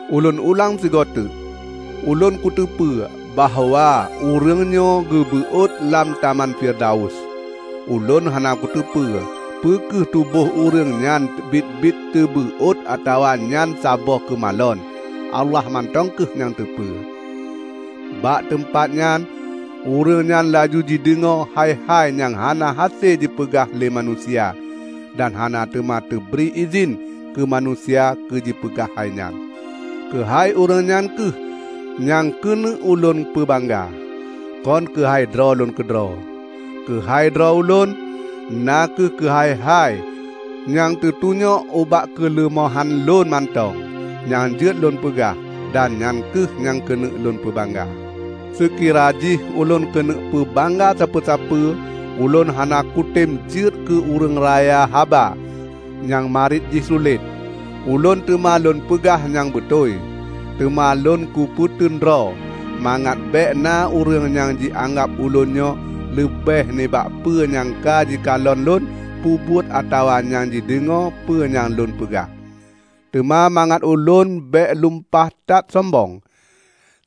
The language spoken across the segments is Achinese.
Ulôn ulang sigoe teuk: Ulôn kuteupeu bahwa ureuëng nyoe geubeuôt lam taman Firdaus. (Ulôn hana kuteupeu peu kheueh tuboh ureuëng nyan biet-biet teubeuôt atawa nyan saboh keumalon -- Allah mantong kheueh nyang teupeu.) Bak teumpat nyan ureuëng nyan laju jideungoe hai-hai nyang hana hase jipeugah lé manusia dan hana teuma teubri idhin keu manusia keujipeugah hai nyan. Keuhai ureuëng nyan kheueh nyang keuneuk ulôn peubangga, kon keuhai droe lôn keudroe. Keuhai droe ulôn, na kheueh keuhai-hai nyang teutunyok ubak keuleumohan lôn mantong nyang jeuet lôn peugah, dan nyan kheueh nyang keuneuk lôn peubangga. Seukira jih ulôn keuneuk peubangga sapeue-sapeue, ulôn hana kutem jeuet keu ureuëng raya haba nyang mariet jih sulet; ulôn teuma lôn peugah nyang beutôi. Teuma lôn kupeuteun droe, mangat bék na ureuëng nyang jianggab ulôn nyoe leubeh nibak peue nyang ka jikalon lôn peubuet atawa nyang jideungoe peue nyang lôn peugah. Teuma mangat ulôn bék lumpah that sombong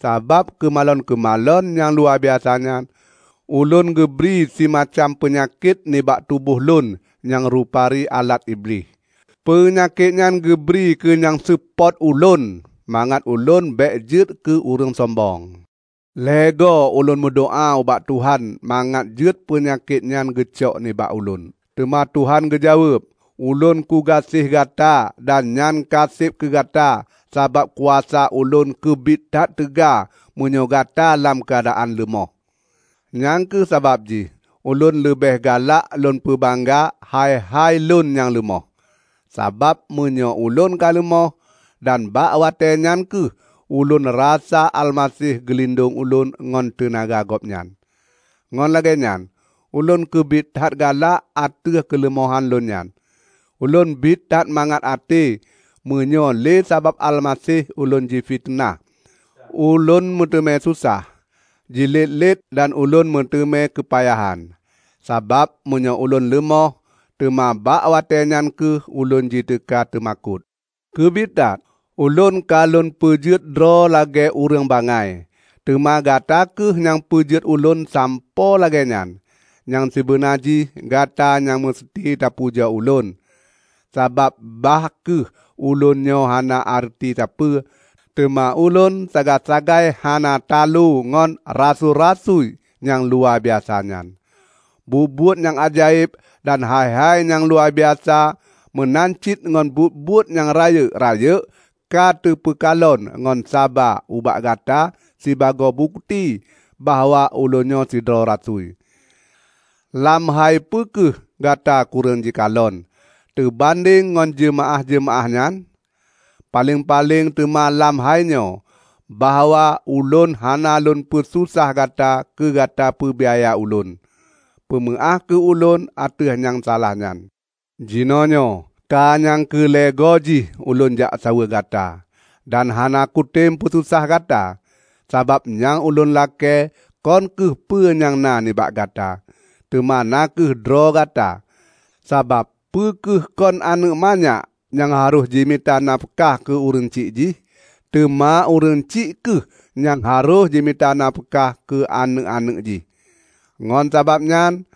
sabab keumalon-keumalon nyang luwabiasa nyan, ulôn geubri simacam peunyakét nibak tuboh lôn nyang rupari alat Iblih. Peunyakét nyan geubri keu nyang seupôt ulôn mangat ulôn bék jeuet keu ureuëng sombong. Lhée goe ulôn meudoá ubak Tuhan mangat jeuet peunyakét nyan geucok nibak ulôn. Teuma Tuhan geujaweueb, "Ulôn kugaséh gata dan nyan ka seb keugata; sabab kuasa Ulôn keubiet that teuga meunyoe gata lam keuadaan leumoh." Nyang kheueh sabab jih ulôn leubeh galak lôn peubangga hai-hai lôn nyang leumoh, sabab meunyoe ulôn ka leumoh, dan bak watée nyan kheueh ulôn rasa Almaseh geulindong ulôn ngon teunaga Gobnyan. Ngon lagée nyan ulôn keubiet that galak ateueh keuleumohan lôn nyan. Ulôn biet that mangat até meunyoe lé sabab Almaseh ulôn jifiteunah, ulôn meuteumé susah, jilet-let dan ulôn meuteumé keupayahan. Sabab meunyoe ulôn leumoh, teuma bak watée nyan kheueh ulôn jiteuka teumakot. Keubiet that, ulôn ka lôn peujeuet droe lagée ureuëng bangai -- teuma gata kheueh nyang peujeuet ulôn sampoe lagée nyan. Nyang sibeuna jih gata nyang meusti tapujoe ulôn. Sabab, bah kheueh ulôn nyoe hana areuti sapeue, teuma ulôn sagai-sagai hana taloe ngon "rasui-rasui" nyang luwabiasa nyan! Buet-buet nyang ajaéb dan hai-hai nyang luwabiasa meunan cit ngon buet-buet nyang rayeuk-rayeuk ka teupeukalon ngon saba ubak gata sibagoe bukeuti bahwa ulôn nyoe sidroe rasui. Lam hai peue kheueh gata kureueng jikalon, teubandeng ngon jeumaáh-jeumaáh nyan? Paleng-paleng teuma lam hai nyoe: bahwa ulôn hana lôn peususah gata keugata peubiaya ulôn. Peumeuáh kheueh ulôn ateueh nyang salah nyan! Jinoenyoe ka nyang keu lhée goe jih ulôn jak saweue gata. Dan hana kutem peususah gata, sabab nyang ulôn lakée kon kheueh peue nyang na nibak gata, teuma na kheueh droe gata. Sabab peu kheueh kon aneuëk manyak nyang harôh jimita nafeukah keu ureuëng syiek jih, teuma ureuëng syiek kheueh nyang harôh jimita nafeukah keu aneuëk-aneuëk jih. Ngon sabab nyan,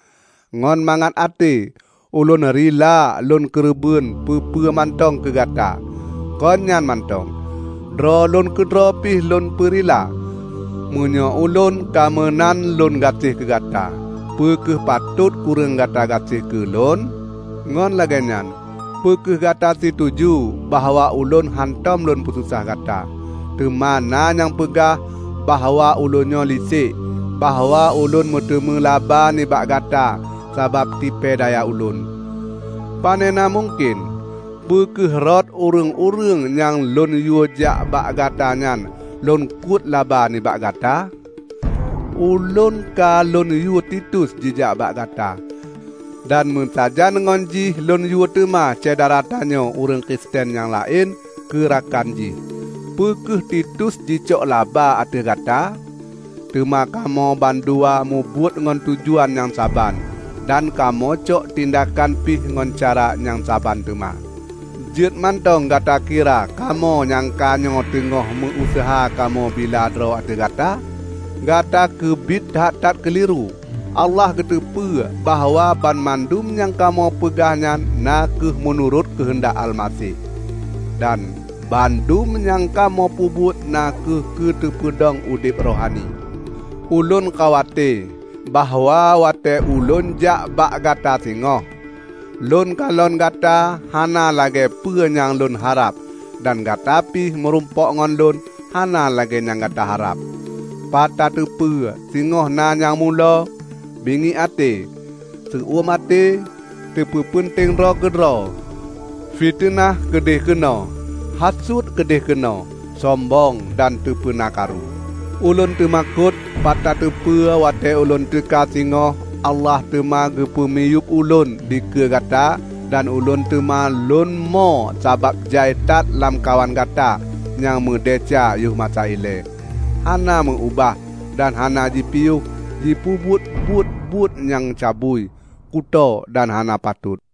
ngon mangat até ulôn rila lôn keureubeuen peue-peue mantong keugata, kon nyan mantong, droe lôn keudroe pi lôn peurila. Meunyoe ulôn ka meunan lôn gaséh keugata, peu kheueh patot kureueng gata gaséh keu lôn? Ngon lagée nyan, peu kheueh gata situju bahwa ulôn hántom lôn peususah gata. Teuma na nyang peugah bahwa ulôn nyoe lisek; bahwa ulôn meuteuma laba nibak gata sabab tipée daya ulôn. Panena mungken! Peu kheueh rot ureuëng-ureuëng nyang lôn yuejak bak gata nyan lônkuet laba nibak gata? Ulôn ka lôn yue Titus jijak bak gata, dan meusajan ngon jih lôn yue teuma syedara tanyoe ureuëng Kristen nyang laén keurakan jih. Peu kheueh Titus jicok laba ateueh gata? Teuma kamoe bandua mubuet ngon tujuan nyang saban dan kamoe cok tindakan pih ngon cara nyang saban teuma. Jeuet mantong gata kira kamoe nyang kanyoe teungoh meu-useuha kamoe bila droe ateueh gata? Gata keubiet that-that keuliru! Allah geuteupeue bahwa banmandum nyang kamoe peugah nyan na kheueh meunurot keuheundak Almaseh. Dan bandum nyang kamoe peubuet na kheueh keu teupeudong udeb rohani. Ulôn khawate bahwa watée ulôn jak bak gata singoh, lôn kalon gata hana lagée peue nyang lôn harab dan gata pih meurumpok ngon lôn hana lagée nyang gata harab. Pat tateupeue singoh na nyang mulo, bingiek até, seu-uem até, teupeupeunteng droe keudroe, fiteunah keudeh keunoe, hasut keudeh keunoe, sombong dan teupeuna karu. Ulôn teumakot pat tateupeue watée ulôn teuka singoh Allah teuma geupumiyueb ulôn dikeue gata dan ulôn teuma lônmo sabab jai that lamkawan gata nyang meudesya yoh masa ilée, hana meu-ubah dan hana jipiôh jipeubuet buet-buet nyang cabui, kutoe dan hana patot.